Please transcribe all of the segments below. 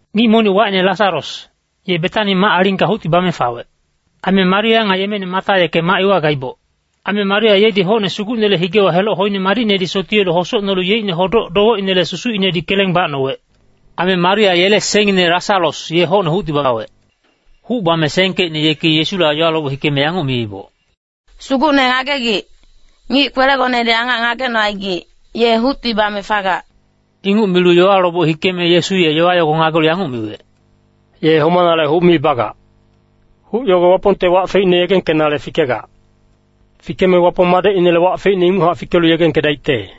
Ngic monic wacine Lasaros, ye Betani mac-alingka hucti bame fawec. Aime Maria nga yemeine Mata yeke mac iwa gaiboc. Aime Maria yedi hocne Sugucnele higewa heloc hoine madicnedi sotiyelu hosocnolu yeicne hodoc-dowecinele susucinedi keleng bacnowec. Aime Maria yele sengngine Lasaros ye hocne hucti bawec. Huc bame sengkecine yeki Yesula yowa loboc hikeme yanguc miiboc, “Sugucne ngagegic, ngic kwelegonedi angac ngagecnocaigic, ye hucti bame fagac.” Inguc milu yowa loboc hikeme Yesu ye yowa yogo ngagelu yanguc miwec, “Ye homanale huc mi bagac. Huc yogo Wapongte wac feicne yegengkenale fikegac. Fikeme Wapong Madecinele wac feicne inguchac fikelu yegengkedaicte.”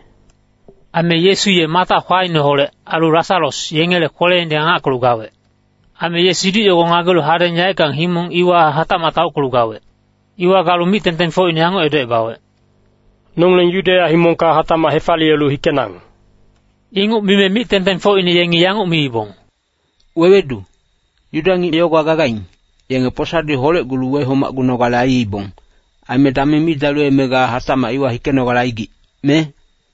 Aime Yesu ye Mata kwaineholec, ailu Lasaros yengele kweleinedi angackelu gawec. Aime ye siduc yogo ngagelu hadeng yaeckang himong iwa hatacmac taockelu gawec. Iwa galu mic-tengtengfocine yanguc edocebawec, “Nongileng Yudeya himongka hatacmac hefaliyelu hikenang.” Inguc mime mic-tengtengfocine yengi yanguc miibong, “Wewedu, Yuda ngic yogowa gagaing, yenge posadi holecgulu wehomacgunogale aiibong. Aime dameng mi daliweme ga hatacmac iwa hikenogale aigic, me?”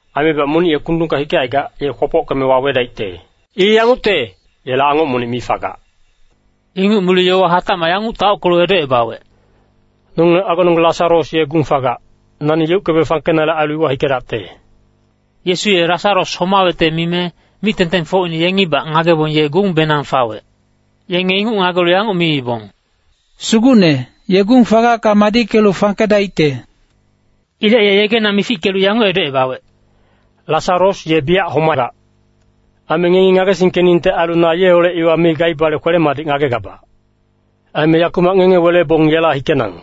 Aimebac monic ye kundungka hikecaigac, ye kwopockeme wawedaicte. I yangucte, yela angoc monic mi fagac.” Inguc milu yowa hatacmac yanguc taockelu edocebawec, “Nongileng agononggeng Lasaros ye gung fagac, nani yeuckebe fangkenale ailu iwa hikedacte.” Yesu ye Lasaros homawecte mime, mic-tengtengfocine yengibac ngagebong ye gungbenang fawec. Yenge inguc ngagelu yanguc miibong, “Sugucne, ye gung fagacka madickelu fangkedaicte.” Ilec ye yegena mifickelu yanguc edocebawec, “Lasaros ye biyac homagac. Aime ngengi ngagesingkeningte ailu na yeholec iwa mi gaibale kwele-madic ngagegabac. Aime yakumac ngenge welebong yela hikenang.”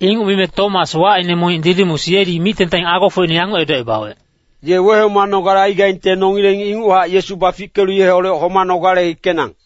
Inguc mime Tomas wacine monic Didimus yedi mic-tengteng agofocine yanguc edocebawec, “Ye wehomanogale aigaingte nongileng inguchac Yesu bafickelu yeholec homanogale hikenang.”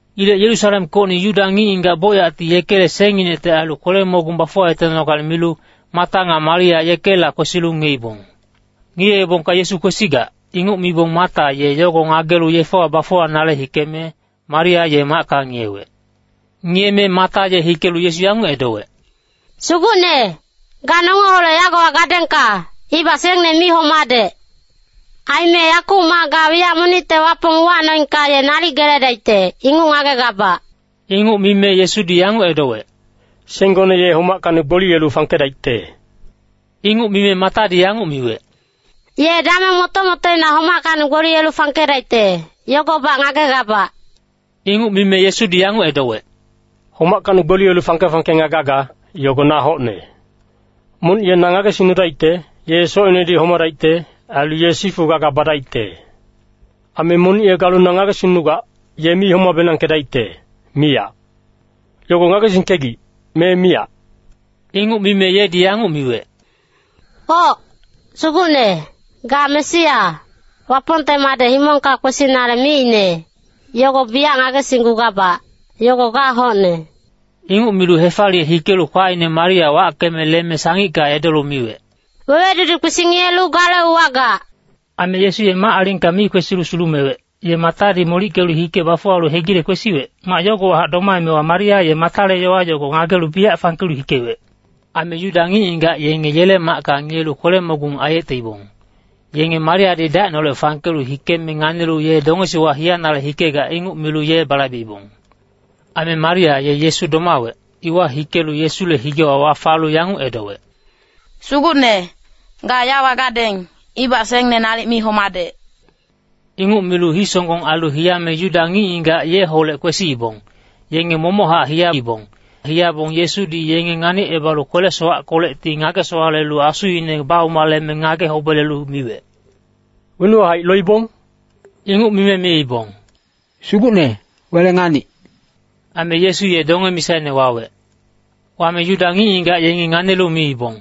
Ilec Yerusalemkocni Yuda ngic-ngigac bocyacti yekele sengnginecte ailu kwele-mogung bafuwayetenogale milu, Mata nga Maria yekela kwesilu ngiyeibong. Ngiyeebongka Yesu kwesigac, inguc mibong Mata ye yogo ngagelu yefewa bafuwanale hikeme, Maria ye macka ngiyewec. Ngiyeme Mata ye hikelu Yesu yanguc edowec, “Sugucne, ga nongeholec yagowa gadengka, ibac sengne mi homadec. Aime yakumac ga wiyac monicte Wapong uwacnoengka ye nalic geledaicte, inguc ngagegabac.” Inguc mime Yesudi yanguc edowec, “Senggone ye homackacni gboliyelu fangkedaicte.” Inguc mime Matadi yanguc miwec, “Ye dameng moto-motoina homackacni gboliyelu fangkedaicte, yogobac ngagegabac.” Inguc mime Yesudi yanguc edowec, “Homackacni gboliyelu fangke-fangke nga gaga, yogo na hocne. Monic ye na ngagesingnudaicte, ye socinedi homadaicte, ailu ye sifu gaga badaicte. Aime monic ye galu ngagesingnugac, ye mi homabenangkedaicte, miyac. Yogo ngagesingkegic me miyac?” Inguc mime yedi yanguc miwec, “Oc, Sugucne, ga Mesia, Wapongte Madec himongka kwesinale miicne, yogo biyac ngagesinggugabac, yogo ga hocne.” Inguc milu hefaliye hikelu kwaine Maria wackeme leme sangicka edolu miwec, “Wewedudi kwesi ngiyelu gale uwagac.” Aime Yesu ye mac-alingka mi kwesilu sulumewec, ye Matadi molickelu hike bafuwalu hegile kwesiwec, mac yogowahac domaemewa Maria ye Matale yowa yogo ngagelu biyac fangkelu hikewec. Aime Yuda ngic-ngigac yenge yele macka ngiyelu kwele-mogung aiyeteibong, yenge Mariadi dacineholec fangkelu hikeme nganilu ye dongesiwa hiyanale hikegac, inguc milu ye balaibeibong. Aime Maria ye Yesu domawec, iwa hikelu Yesule higewa wafalu yanguc edowec, “Sugucne, ga yawa gadeng, ibac sengne nalic mi homadec.” Inguc milu hii-songgong ailu hiyame Yuda ngic-ngigac yeholec kwesiibong, yenge momochac hiyaibong. Hiyabong Yesudi yenge nganicebalu kwele-sowackolecti ngage-sowalelu asuine baumaleme ngage-hobelelu miwec, “Wenuwa haic loibong?” Inguc mime miibong, “Sugucne, wele nganic.” Aime Yesu ye donge misaine wawec. Wame Yuda ngic-ngigac yengi nganilu miibong,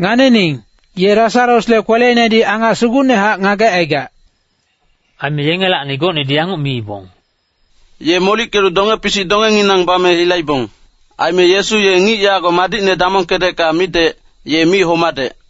“Nganining, ye Lasarosle kweleinedi angac sugucnehac ngagecaigac.” Aime yengelacni gocnedi yanguc miibong, “Ye molickelu donge-pisic dongenginang bame hilaibong. Aime Yesu ye ngic yago madicne damongkedecka midec, ye mi homadec.”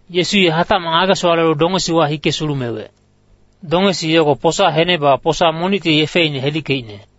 Yesu ye hatacmac ngage-sowalelu dongesiwa hike sulumewec. Dongesi yogo posa henebewa posa monicti yefeine hedickeicne.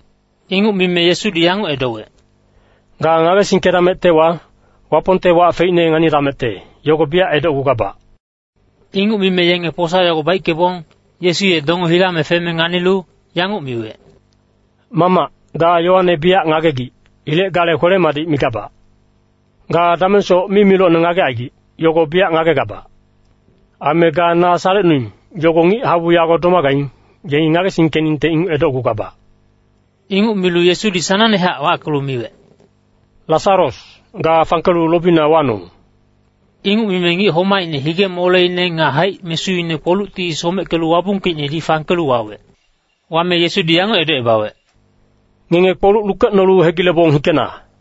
Inguc mime Yesudi yanguc edowec, “Ga ngagesingkedamectewa, Wapongte wac feicne nganidamecte, yogo biyac edocgugabac.” Inguc mime yenge posa yogo baickebong, Yesu ye donge hilame feme nganilu, yanguc miwec, “Mamac, ga yowane biyac ngagegic. Ilec gale kwele-madic migabac. Ga damengsoc mimilocne ngagecaigic, yogo biyac ngagegabac. Aime ga na salecnuing, yogo ngic-habu yago domagaing, yengi ngagesingkeningte inguc edocgugabac.” Inguc milu Yesudi sanangnehac wackelu miwec, “Lasaros, ga fangkelu lobina wanong.” Inguc mime ngic homaicne hige-moleine nga haic-mesuine kpolucti someckelu wabungkeicnedi fangkelu wawec. Wame Yesudi yanguc edocebawec, “Ngenge kpoluc lukecnolu hegilebong hikena.”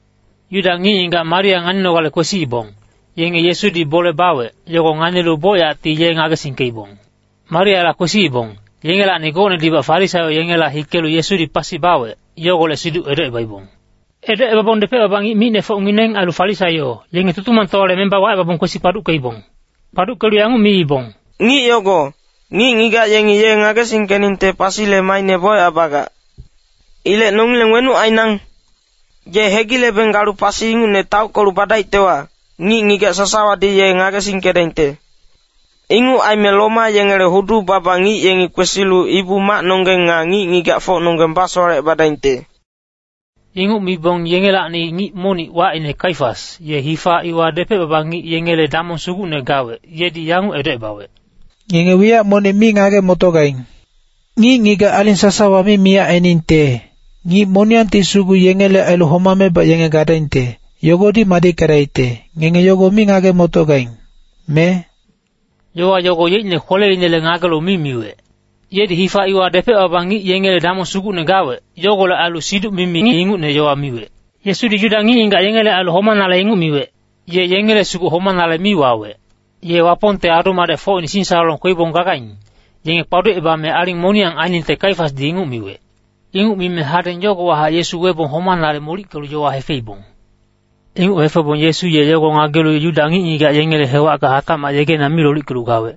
Yuda ngic-ngigac Maria nganinogale kwesiibong, yenge Yesudi bole bawec, yogo nganilu bocyacti ye ngagesingkeibong. Mariala kwesiibong, yengelacni gocnedibac Farisaio yengela hikelu Yesudi pasi bawec, yogolec siduc edocebaibong. Edocebabong depec-baba ngic micnefocngineng ailu Farisaio, yenge Tutumangtowale memba wacebabong kwesi kpaduckeibong. Kpaduckelu yanguc miibong, “Ngic yogo, ngic-ngigac yengi ye ngagesingkeningte pasile maaine bocyac bagac. Ilec nongileng wenuc ainang? Ye hegilebeng galu pasi ingucne taockelu badaictewa, ngic-ngigac sasawadi ye ngagesingkedaingte. Inguc aime Roma yengele hudu-baba ngic yengi kwesilu Ibu-macnonggeng nga ngic-ngigacfocnonggeng basowalecebadaingte.” Inguc mibong yengelacni ngic monic wacine Kaifas, ye hifa iwa depec-baba ngic yengele damong sugucne gawec, yedi yanguc edocebawec, “Ngenge wiyac monic mi ngage-motogaing. Ngic-ngigac aling sasawa mi miyac ainingte, ngic moniyangti sugu yengele ailu homamebac yenge gadaingte, yogodi madickedaicte, ngenge yogo mi ngage-motogaing, me?” Yowa yogo yeicne kweleinele ngagelu mi miwec. Yedi hifa iwa depec-baba ngic yengele damong sugucne gawec. Yogolec ailu siduc-mimi ngic ingucne yowa miwec. Yesudi Yuda ngic-ngigac yengele ailu homanale inguc miwec. Ye yengele sugu homanale mi wawec. Ye Wapongte adu-madecfocine singsalolong kweibong gagaing, yenge kpaducebame aling moniyang ainingte Kaifasdi inguc miwec. Inguc mime hadeng yogowahac Yesu webong homanale molickelu yowa hefeibong. Inguc hefebong Yesu ye yogo ngagelu Yuda ngic-ngigac yengele hewacka hatacmac yegena mi lolickelu gawec.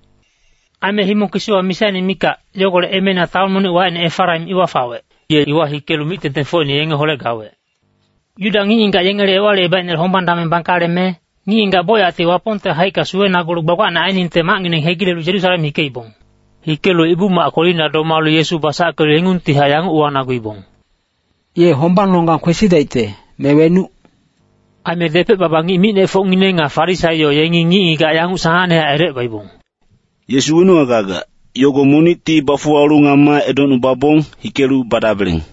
Aime himong kisiwa misaine mikac, yogolec emeina taon monic wacine Efaraim iwa fawec. Ye iwa hikelu mic-tengtengfocine yengeholec gawec. Yuda ngic-ngigac yengele Ewalicebaicnele hombang dameng bangkaleme, ngic-ngigac bocyacti Wapongte haicka suwenagulu gbagbacne ainingte macngineng hegilelu Yerusalem hikeibong. Hikelu Ibu-mac kwelina domalu Yesu basackelu yengungtihac yanguc uwanaguibong, “Ye hombangnonggang kwesidaicte, me wenuc?” Aime depec-baba ngic micnefocngineng nga Farisaio yengi ngic-ngigac yanguc sanangnehac edocebaibong, “Yesu wenuwa gagac, yogo monicti bafuwalu ngama edocnubabong, hikelu badabeleng.”